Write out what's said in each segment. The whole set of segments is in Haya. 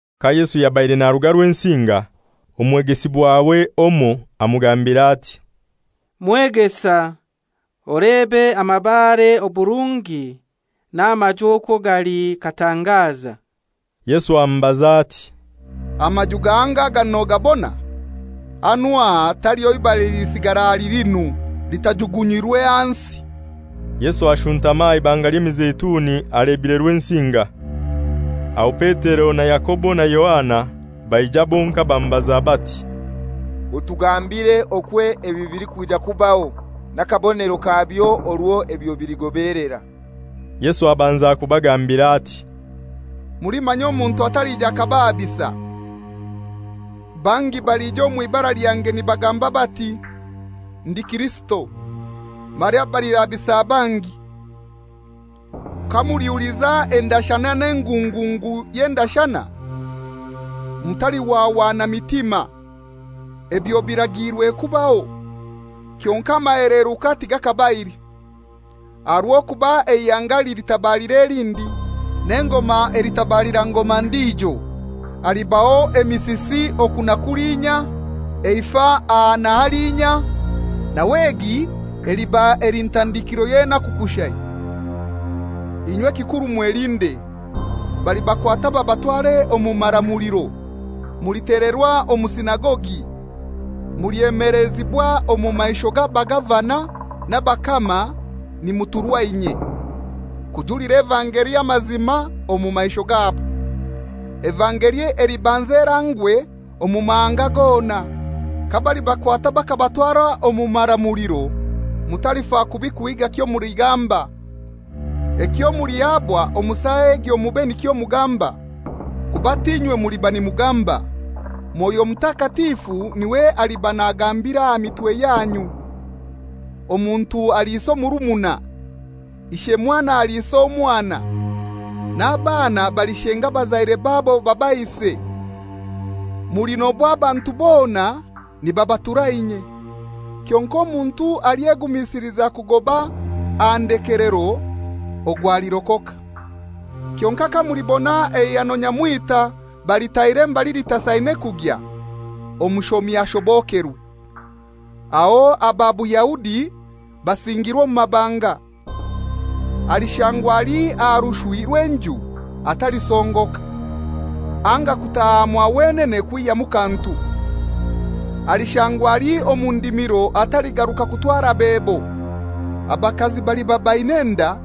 Ka Yesu yabaire naruga Rwensinga, omwegesibwawe omoi amugambira ati, «Mwegesa, olebe amabare oburungi n'amaju okwo gali katangaza!» Yesu amubaza ati, «Amaju gahango aga nogabona? Hanu aha taliho ibare elilisigara ahali linu litajugunyirwe hansi.» Yesu ashuntama aha Ibanga ly'Emizeituni alebire Rwensinga. Aho Petero na Yakobo na Yohana baija bonkai bamubaza bati, «Otugambire okwo ebi bilikwija kubaho, n'akabonero kabyo orwo ebyo biligobelera.» Yesu abanza kubagambira ati, «Mulimanya omuntu atalija akabahabisa. Bangi balija omw'ibara lyange nibagamba bati, ‹Ndi Kirisito!› Mara balihabisa bangi. Kamulihuliza endashana n'engungungu y'endashana, mutalihwahwana mitima. Ebyo biragiirwe kubaho, kyonkai amaheleruka tigakabaire. Aha rw'okuba eihanga lilitabalira elindi, n'engoma elitabalira ngoma ndijo; halibaho emisisi oku na kulinya, eifa aha na halinya; nawe egi eliba eli ntandikiro y'enaku kushai. «Inywe ekikuru mwelinde. Balibakwata babatware omu maramuliro. Mulitelerwa omu sinagogi, mulyemelezibwa omu maisho g'abagavana n'abakama nimuturwa inye, kujulira evangeli amazima omu maisho gabo. Evangeli elibanza erangwe omu mahanga gona. Kabalibakwata bakabatwara omu maramuliro, mutalifa kubi kuhiiga kyomuligamba. Ekyo mulihabwa omu saa egyo mube nikyo mugamba, kuba t'inywe muliba nimugamba. Mwoyo Mutakatifu n'iwe aliba nagambira aha mitwe yanyu. Omuntu aliisa omurumuna, ishe mwana aliisa omwana, n'abaana balishenga abazaire babo babaise. Mulinobwa abantu bona nibabatura inye. Kyonkai omuntu alyegumisiliza kugoba aha ndekelero ogwo alirokoka «Kyonkai kamulibona eihano nyamwita balitaire mbali litasaine kugya (omushomi ashobokerwe), aho aba Buyahudi basingirwe omu mabanga. Alishangwa ali aha rushwi rw'enju atalisongoka, anga kutaha mwa wenene kwihyamu kantu. Alishangwa ali omu ndimiro ataligaruka kutwara bebo. Abakazi baliba baina enda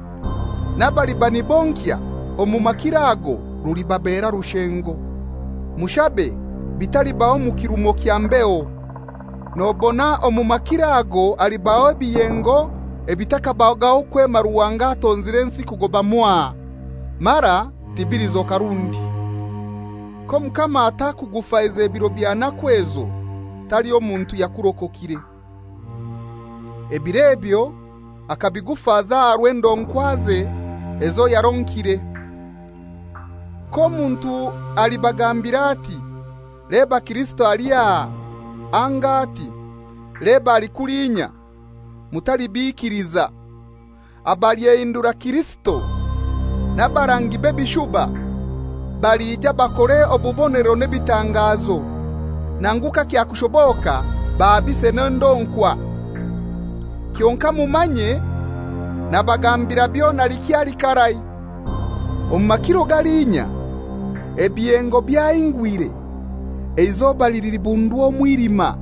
n'abaliba nibonkya omu makiro ago rulibabeera rushengo! Mushabe bitalibaho mu kirumo kya mbeho. Nobona omu makiro ago halibaho ebiyengo ebitakabagaho kwema Ruhanga atonzire ensi kugoba mwaha, mara tibilizoka rundi. K'Omukama atakugufaize biro bya naku ezo, taliho muntu yakurokokire. Ebiro ebyo akabigufaza aha rw'endonkwaze ezo yaronkire. K'omuntu alibagambira ati, ‹Leba Kirisito ali aha,› anga ati, ‹Leba ali kulinya!› Mutalibikiliza. Abalyehindura Kirisito n'abarangi b'ebishuba balija bakore obubonero n'ebitangazo, nangu kakyakushoboka bahabise n'endonkwa. Kyonkai mumanye; nabagambira byona likyali karai. «Omu makiro galiinya, ebiyengo byahingwire, eizoba lilibundwa omwilima,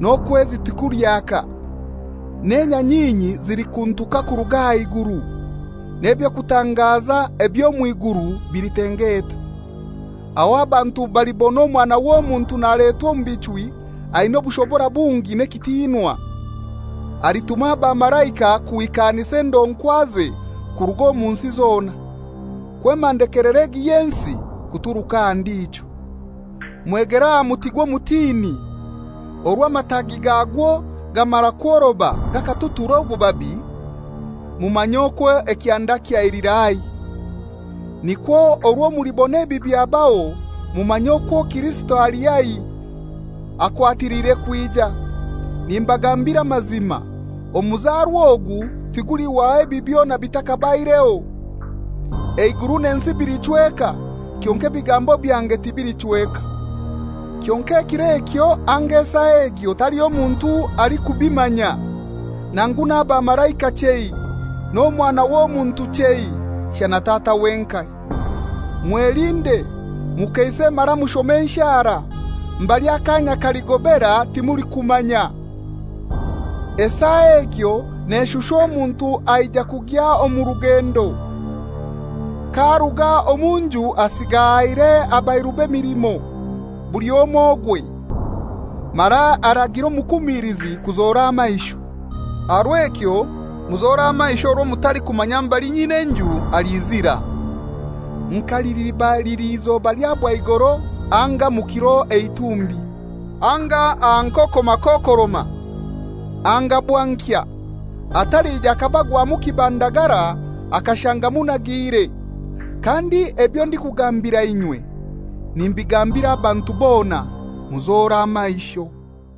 n'okwezi tikulyaka, n'enyanyinyi zilikuntuka kuruga aha iguru, n'eby'okutangaza eby'omw'iguru bilitengeta. Aho abantu balibona Omwana w'Omuntu naletwa omu bichwi aina obushobora bungi n'ekitinwa. Alituma abamalaika kuhikanisa endonkwaze kuruga omu nsi zona, kwema ndekelero egi y'ensi kuturuka aha ndijo. «Mwegere aha muti gw'omutini: Orwo amatagi gagwo gamara kworoba gakatutura obubabi, mumanya okwo ekyanda kyailira haihi. Nikwo orwo mulibona ebi byabaho, mumanye okwo Kirisito ali haihi, akwatiliire kwija. Nimbagambira amazima, omuzarwa ogu tigulihwaho ebi byona bitakabaireho. Eiguru n'ensi bilichweka, kyonkai ebigambo byange tibilichweka. «Kyonkai ekiro ekyo anga esaa egyo taliho muntu alikubimanya, nangu n'abamalaika chei, n'Omwana w'Omuntu chei, shana Tata wenkai. Mwelinde, mukeise mara mushome enshara. Mbali akanya kaligobera timulikumanya. Esaa egyo neshusha omuntu aija kugya omu rugendo, k'aruga omu nju asiga ahaire abairube emilimo, buli omoi ogwe, mara aragira omukumilizi kuzora amaisho. Aha rw'ekyo muzore amaisho orwo mutalikumanya mbali nyin'enju aliizira, nka liliba lili izoba lya bwaigoro anga mu kiro eitumbi, anga aha nkoko makokoroma, anga bwankya, atalija akabagwamu kibandagara akashanga munagiire. Kandi ebyo ndikugambira inywe nimbigambira abantu bona: Muzore amaisho.»